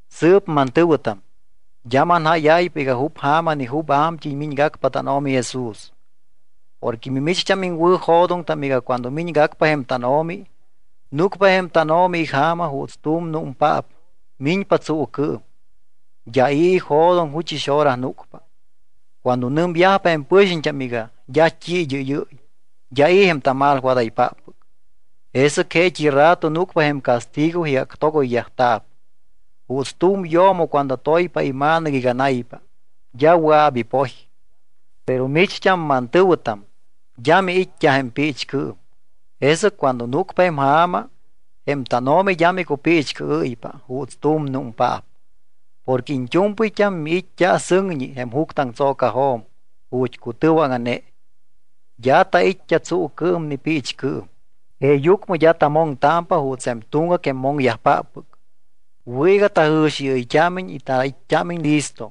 Sɨɨp mantɨ̱wɨtam, d́a manjáyáypa iga jup ja̱ma ni jup a̱mt́ɨy miñgacpa tánO̱mi Jesús. Porque mimicht́am iŋwɨ̱jo̱doŋtam iga cuando miñgacpa jém tánO̱mi, núcpa jém tánO̱mi ija̱ma juuts tu̱m númpaap miñpa tsuucɨɨm. D́a i̱ ijo̱doŋ juchɨs hora núcpa. Cuando nɨmyajpa jém pɨxiñt́am iga: “D́a t́i id́ɨ́yɨ́y, d́a i̱ jém tamalwadaypáppɨc”, jesɨc jeet́i rato núcpa jém castigo iga actogoyyajta̱p. Juuts tu̱m yo̱mo cuando toypa ima̱nɨc iga naypa, d́a wɨa̱p ipoy. Pero micht́am, mantɨ̱wɨtam, d́a miit́t́a jém piichcɨɨm, jesɨc cuando núcpa jém ja̱ma, jém tánO̱mi d́a micupiichcɨɨ́ypa juuts tu̱m númpaap. Porque iñt́u̱mpɨyt́am miit́t́a sɨŋñi jém juctɨaŋtso̱cajo̱m ju̱t́ cutɨwaŋa̱ne. D́a tait́t́a tsuucɨɨm ni piichcɨɨm. Jeeyucmɨ d́a tamoŋtámpa juuts jém tuŋgac jém moŋyajpáppɨc. Wɨ̱ iga tajɨ̱xiɨyt́ámiñ iga tait́t́ámiñ listo.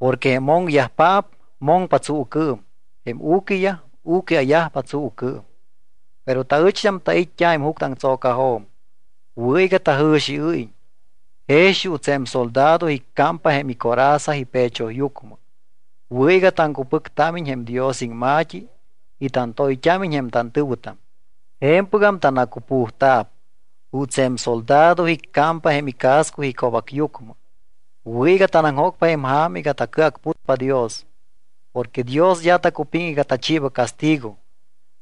Porque jém moŋyajpaap moŋpa tsuucɨɨm, jém u̱quiyaj u̱quia̱yajpa tsuucɨɨm. Pero taɨcht́am tait́t́a jém juctɨaŋtso̱cajo̱m, wɨ̱ iga tajɨ̱xiɨ́yiñ. Jex juuts jém soldado icámpa jém icoraza ipechoyucmɨ, wɨ̱ iga taŋcupɨctámiñ jém Dios iŋma̱t́i y tantoyt́ámiñ jém tantɨ̱wɨtam, je̱mpɨgam tanacupujta̱p. Juuts jém soldado icámpa jém icasco ico̱bacyucmɨ, wɨ̱ iga tanaŋjócpa jém ja̱ma iga tacɨacputpa Dios. Porque Dios d́a tacupiŋ iga tachiiba castigo,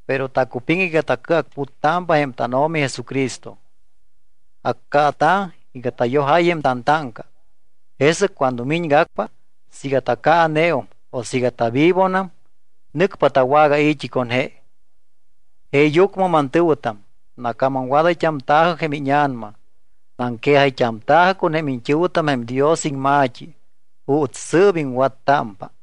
pero tacupiŋ iga tacɨacputtámpa jém tánO̱mi Jesucristo. Accaata̱ iga tayojáy jém tantáŋca. Jesɨc cuando miñgacpa, siiga tacaaneum o siiga tavivonam, nɨcpa tawagai̱t́i con je. Jeeyucmɨ mantɨ̱wɨtam, nacamamwadayt́amta̱jɨ jém íña̱nama, naŋquejayt́amta̱jɨ con jém iñt́ɨ̱wɨtam jém Dios iŋma̱t́i juuts sɨɨp iŋwattámpa.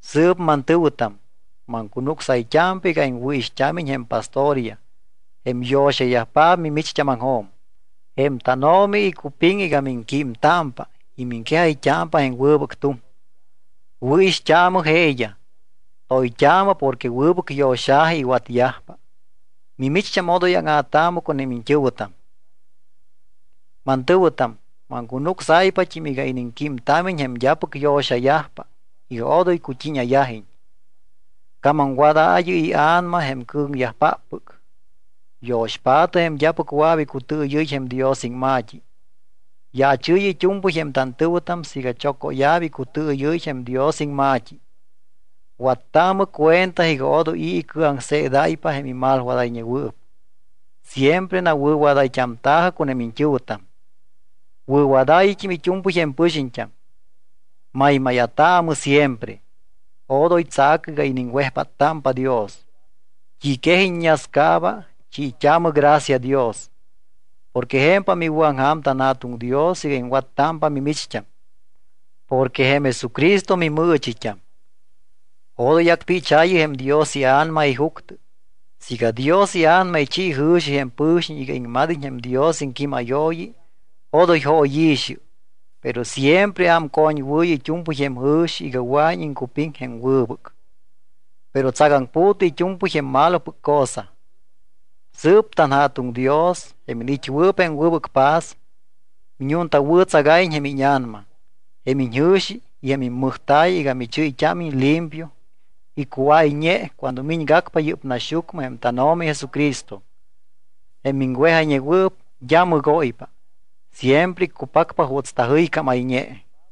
Sɨɨp mantɨ̱wɨtam, maŋcunucsayt́ámpa iga iŋwɨ̱ixt́ámiñ jém pastoryaj, jém yo̱xayajpaap mimicht́ámaŋjo̱m. Jém tánO̱mi icupiŋ iga miŋquímtámpa y miŋquejayt́ámpa jém wɨbɨc tuŋ. Wɨ̱ixt́aamɨ jeeyaj, toyt́aamɨ porque wɨbɨc yo̱xa̱ji iwatyajpa. Mimicht́am odoy áŋa̱taamɨ con jém iñt́ɨ̱wɨtam. Mantɨ̱wɨtam, maŋcunucsáypat́im iga iniŋquímtámiñ jém d́apɨc yo̱xayajpa iga odoy cut́íña̱yajiñ. Camamwadaayɨ ia̱nama jém cɨ̱ŋyajpáppɨc. Yo̱xpaatɨ jém d́apɨc wɨa̱p icutɨɨyɨ́y jém Dios iŋma̱t́i. Yaachɨɨyɨ it́u̱mpɨy jém tantɨ̱wɨtam siiga chocóya̱p icutɨɨyɨ́y jém Dios iŋma̱t́i. Wattaamɨ cuenta iga odoy i̱ icɨaŋseedáypa jém imalwadayñewɨɨp. Siempre nawɨ̱wadayt́amta̱jɨ con jém iñt́ɨ̱wɨtam. Wɨ̱wadaayɨt́im it́u̱mpɨy jém pɨxiñt́am. Maymáya̱taamɨ siempre. Odoy tsa̱cɨ iga iniŋwejpáttámpa Dios. T́i quej iññascaaba, chiit́aamɨ gracia Dios, porque je̱mpam iwɨ̱aŋja̱m tanJa̱tuŋ Dios iga iŋwattámpa mimicht́am, porque jém Jesucristo mimɨɨchit́am. Odoy acpichaayɨ jém Dios iA̱nama ijuctɨ. Siiga Dios iA̱nama ichi jɨ̱xi jém pɨ̱xiñ iga iŋmad́iñ jém Dios iŋquímayooyi, odoy jóyi̱xɨ. Pero siempre ámcoñwɨɨyɨ it́u̱mpɨy jém jɨ̱xi iga wɨa̱iñ iŋcupiŋ jém wɨbɨc. Pero tsagaŋpu̱tɨ it́u̱mpɨy jém malopɨc cosa. Sɨɨp tanJa̱tuŋ Dios, jém iniit́wɨɨp jém wɨbɨc paz, miñuntawɨ̱tsagáyiñ jém íña̱nama, jém iñjɨ̱xi y jém immɨjta̱y iga michɨ́yt́ámiñ limpio y cuáyñe cuando miñgacpa yɨ́p naxyucmɨ jém tánO̱mi Jesucristo. Jém miŋwejayñewɨɨp d́a mɨgóypa, siempre iccupacpa juuts tajɨycámayñe.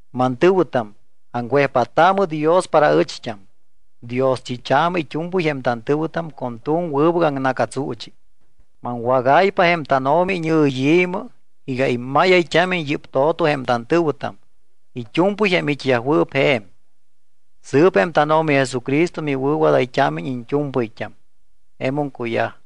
Mantɨ̱wɨtam, aŋwejpáttaamɨ Dios para aɨcht́am. Dioschit́aamɨ it́u̱mpɨy jém tantɨ̱wɨtam con tu̱m wɨbɨc aŋna̱catsuuchi. Maŋwágáypa jém tánO̱mi iñɨyi̱mɨ iga immáyayt́ámiñ yɨ́p to̱to jém tantɨ̱wɨtam it́u̱mpɨy jém it́yajwɨɨp je̱m. Sɨɨp jém tánO̱mi Jesucristo miwɨ̱wadayt́ámiñ iñt́u̱mpɨyt́am. Jemum cuyaj.